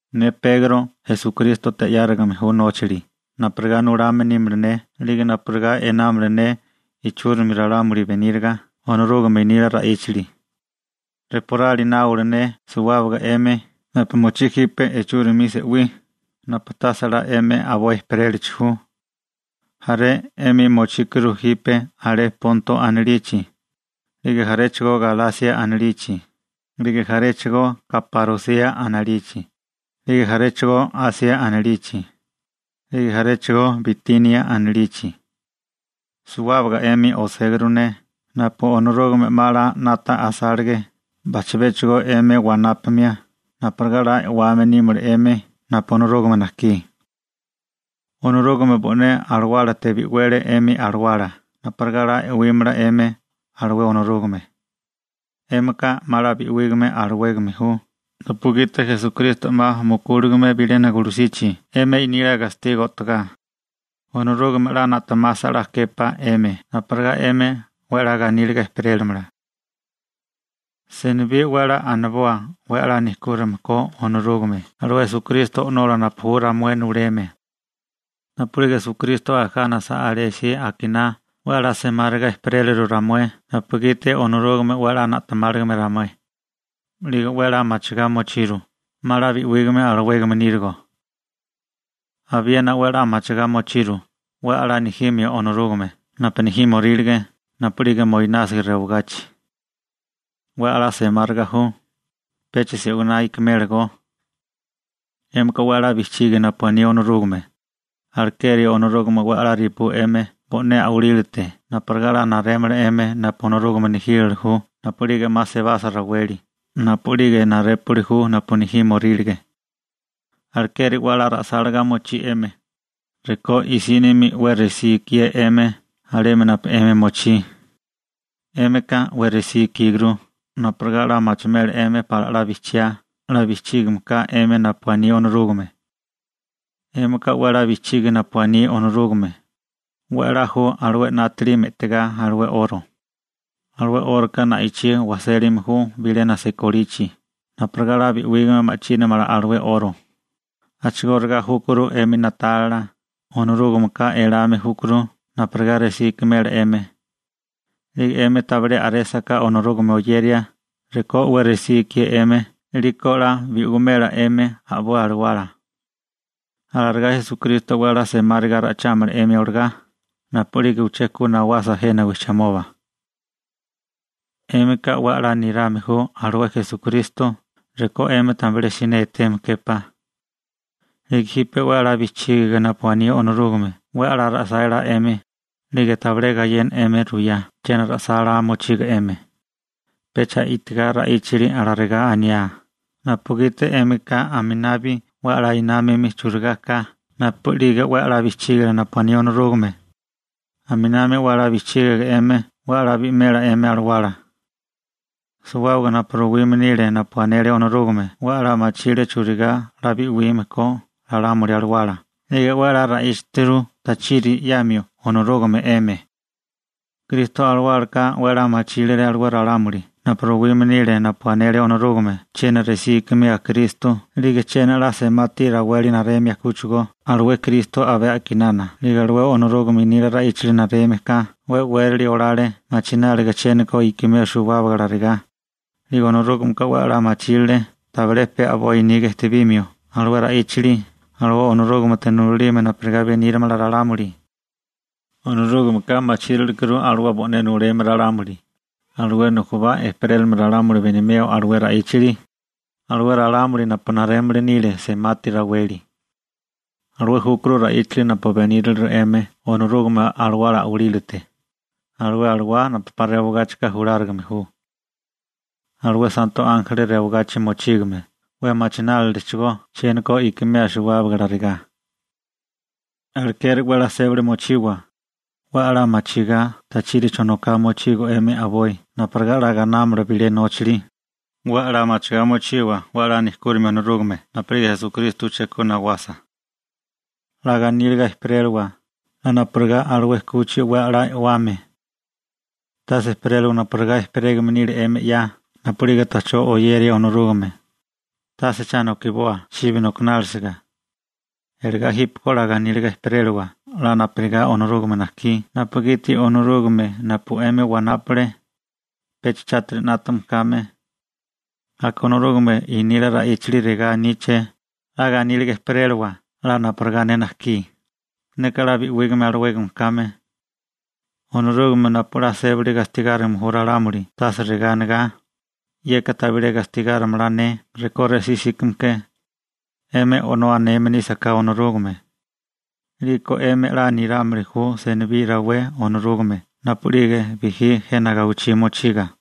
Ne Pegro Esukrístote 'yárigame ju nóchali napurigá nulame nímala ne 'lige napurigá einámala ne ichúrimi ralámuli beníriga Onorúgame nila ra'íchali. Reporali náwala ne suwábaga 'emi napu mochí jipe ichúrimi se'wí napu tase 'la 'emi a'boi ejperélachi ju. Jaré 'emi mochíkuru jipe alé Ponto anilichi, 'lige jaréchigo Galasia anilichi, 'lige jaréchigo Kaparosia anilichi, 'lige jaréchigo Asia anilichi, 'lige jaréchigo Bitinia anilichi. Suwábaga 'emi oséguru ne napu Onorúgame 'ma 'la 'nata asálige bajchabéchigo 'emi wanápamia napurigá 'la e'wame nímala 'emi napu Onorúgame najkí. Onorúgame bo'né Alawálate bi'wele 'emi alawala napurigá 'la e'wímala 'emi alué Onorúgame. 'Émika 'ma 'la bi'wígame alawégame ju napugiti Esukristo 'ma mukúligame bilena gulusichi 'emi nila gastigo o'togá. Onorúgame 'la na'temasa 'la képá 'emi napurigá 'emi 'we 'la ganíliga ejperélamala. Senibí 'we a'lá aniboa 'we a'lá nejkúrame ko Onorúgame alué Esukristo O'nola napu ju ramué nuleme. Napu'lige Esukristo ajánasa alésí akiná 'we a'lá semáriga ejperéliru ramué napugiti Onorúgame 'we a'lá na'temáligame ramué, 'lige 'we a'lá machigá mochiru 'ma 'la bi'wígame alawégame nírigo. Abiena 'we a'lá machigá mochiru 'we a'lá nejimio Onorúgame napu nejímorílige napu'lige moinásiga rewagachi. 'We a'lá semáriga ju, pecha se'winá ikimélagó. 'Émika 'we 'la bijchigi napu aní Onorúgame, alekeri Onorúgame 'we a'lá repú 'emi bo'né a'walílate napurigá 'la narémala 'emi napu Onorúgame nejílala ju napu'lige 'ma sebasa raweli napu'lige narépuli ju napu nejímorílige. Alekeri 'we a'lá ra'sáligá mochí 'emi, rekó i'sínimi 'we resí ikié 'emi alemi napu 'emi mochí. 'Émika 'we resí ikíguru napurigá 'la machimela 'emi pala 'la bijchiá 'la bijchígame ka 'emi napu aní Onorúgame. 'Émika 'we 'la bijchigi napu aní Onorúgame. 'We a'lá ju alué 'nátili me'tigá alué 'oro. Alué 'óroka na'ichí wajsélime ju bilena sikolichi napurigá 'la bi'wígame ma'chínamala alué 'oro. A'chigóriga júkuru 'emi na'tálila, Onorúgameka elame júkuru napurigá resí ikimela 'emi, 'lige 'emi tabilé a'résaká Onorúgame oyeria rekó 'we resí ikié 'emi 'liko 'la bi'wimela 'emi a'boi alawala. Alarigá Esukristo 'we a'lá semáriga ra'ichámala 'emi olagá napu'lige uché ku nawasa jena wijchimoba. 'Émika 'we 'la nirame ju alué Esukristo rekó 'emi tabilé siné eteme képá, 'lige jipe 'we a'lá bijchígiga napu aní Onorúgame 'we a'lá ra'sálá 'emi, 'lige tabilé gayena 'emi ruyá chiena ra'sálá mochigo 'emi, pecha i'tigá ra'íchali alarigá aniá, napugiti 'émika aminabi 'we a'lá námame churigá ka napu'lige 'we 'la bijchígilia napu aní Onorúgame. Aminami 'we 'la bijchígiga 'emi 'we a'lá bi'wimela 'emi alawala. Suwábaga napu ruwime nile napu anele Onorúgame 'we a'lá machile churigá 'la bi'wime ko ralámuli alawala 'lige 'we a'lá ra'íchaturu tachiri 'yamio Onorúgame 'emi. Kristo Alawálaka 'we a'lá machírile alué ralámuli napu ruwime nile napu anele Onorúgame chiena resí ikimeo Kristo 'lige chiena a'lá semati raweli naremio kúchigo alué Kristo abé a'kinana 'lige alué Onorúgame nila ra'íchali nareme ka 'we e'wérali olale machináliga chiéniko ikimeo suwábaga alarigá. 'Lige Onorúgameka 'we 'la machírile tabilé pe a'boi niga ejtebimio alué ra'íchali alué Onorúgamete nulalime napurigá benírimala ralámuli. Onorúgameka machírilekuru alué bo'né nuleme ralámuli, alué nujubá ejperélimili ralámuli benimeo alué ra'íchali, alué ralámuli napu narémili nile semati raweli. Alué júkuru ra'íchali napu beníriliru 'emi Onorúgame Alawala a'walílate, alué Alawá napu 'pa rewagáchika julárigame ju. Alué santo ánjeli rewagachi mochígame 'we machinálilechigó chiéniko ikimeo suwábaga alarigá. Alekeri 'we 'la 'nátaga mochiwa, 'we a'lá machigá tachiri chonoká mochigo 'emi a'boi napurigá 'la gainámala bilé nóchali. 'We a'lá machigá mochiwa 'we a'lá nejkúrimio Onorúgame napu'lige Esukristo uché ku nawasa. 'La ganíliga ejperélawa, 'la napurigá alué 'kuchi 'we a'lá e'wame. Tase ejperélawa napurigá ejperégame nile 'emi 'ya napu'lige ta'chó oyeria Onorúgame, tase cha nokiboa chibi nokinálisiga. Iligá jípeko 'la ganíliga ejperélawa 'la napurigá Onorúgame najkí napugiti Onorúgame napu 'emi wanápale, pecha chátiri 'nátame kame. Aka Onorúgame nila ra'íchali regá aníché: «'La ganíliga ejperélawa 'la napurigá ne najkí, neka 'la bi'wígame alawégame kame.» Onorúgame napu 'la sébali gastigárime ju ralámuli tase regá anigá: «Yeka tabilé gastigárimala ne rekó resí 'síkame ke.» ¡'Emi «O'nó» aneme nísaká Onorúgame, 'liko 'emi 'la nirámili ju senibí rawé Onorúgame napu'lige bijí jena gawichí mochiga,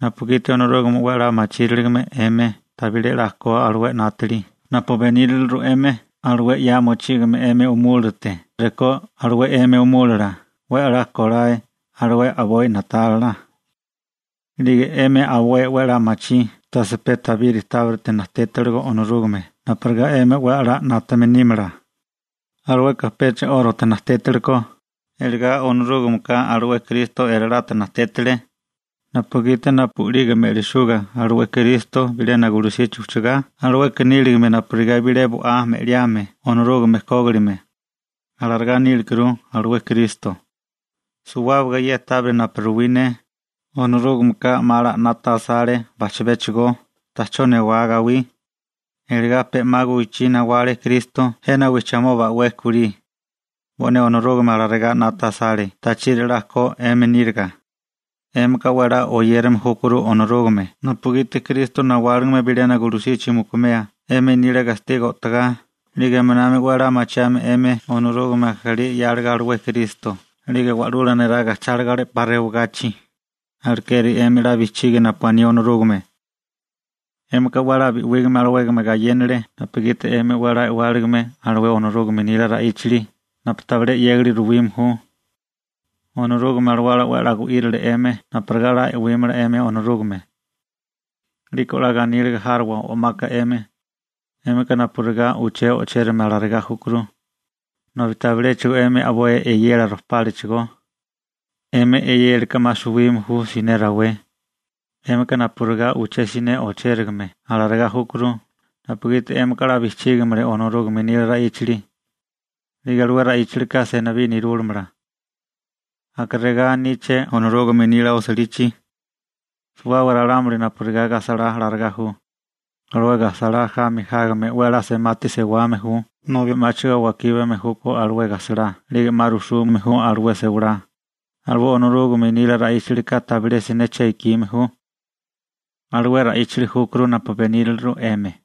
napugiti Onorúgame 'we 'la machíriligame 'emi tabilé 'la ko alué 'nátili napu beníriliru 'emi alué 'ya mochígame 'emi umúlilate rekó alué 'emi umúlila 'we a'lá kolae alué a'boi na'tálila. 'Lige 'emi a'boi 'la machí tase pe tabiri tábirite najtétiligo Onorúgame napurigá 'emi 'we a'lá 'nátame nímala, alueka pecha 'órote najtétilekó, iligá Onorúgameka alué Kristo elalate najtétile, napugiti napu'lige me'lisuga alué Kristo bilena gulusichi ujchagá, alueka níligame napurigá bilé bo'á me'liame Onorúgame kógilime. Alarigá nílekuru alué Kristo. Suwábaga ye tábiri napu ruwí ne, Onorúgameka 'ma 'la 'nata asale bajchibéchigo ta'chó newá gawí, iligá pe 'ma guwichí nawale Kristo jena wijchimoba 'we kulí. Bo'né Onorúgame alarigá 'nata asale tachiri 'la ko 'emi níriga. 'Émika 'we 'la oyérame júkuru Onorúgame napugiti Kristo nawáligame bilena gulusichi mukumea 'emi nila gastigo o'togá 'lige aminami 'we 'la machiame 'emi Onorúgame ajalí 'yáligo alué Kristo 'lige wa'lula neraga ajcháligo alé 'pa rewagachi, alekeri 'emi 'la bijchigi napu aní Onorúgame. 'Émika 'we 'la bi'wígame alawégame gayénale napugiti 'emi 'we 'la e'wáligame alué Onorúgame nila ra'íchali napu tabilé 'yégali ruwime ju. Onorúgame Alawala 'we 'la gu'írile 'emi napurigá 'la e'wímala 'emi Onorúgame. 'Liko 'la ganíliga járowa o'maka 'emi. 'Émika napurigá uché o'chérigame alarigá júkuru, nobi tabiléchigo 'emi a'boi e'yela rojpálachigó, 'emi e'yélaka 'ma suwime ju siné rawé, 'émika napurigá uché siné o'chérigame alarigá júkuru napugiti 'émika 'la bijchígiligame Onorúgame nila ra'íchali, 'lige alué ra'íchalika senibí nerúlamala. Aka regá aníché Onorúgame nila osilichi: Suwábaga ralámuli napurigá gajsalá alarigá ju. Alué gajsalá jami jágame 'we 'la semati sewame ju nobi 'máchigo wakíbame júkó alué gajsalá 'lige 'ma rujsume ju alué sewalá. Alué Onorúgame nila ra'íchalika tabilé siné che ikime ju. Alué ra'íchali júkuru napu beníriliru 'emi.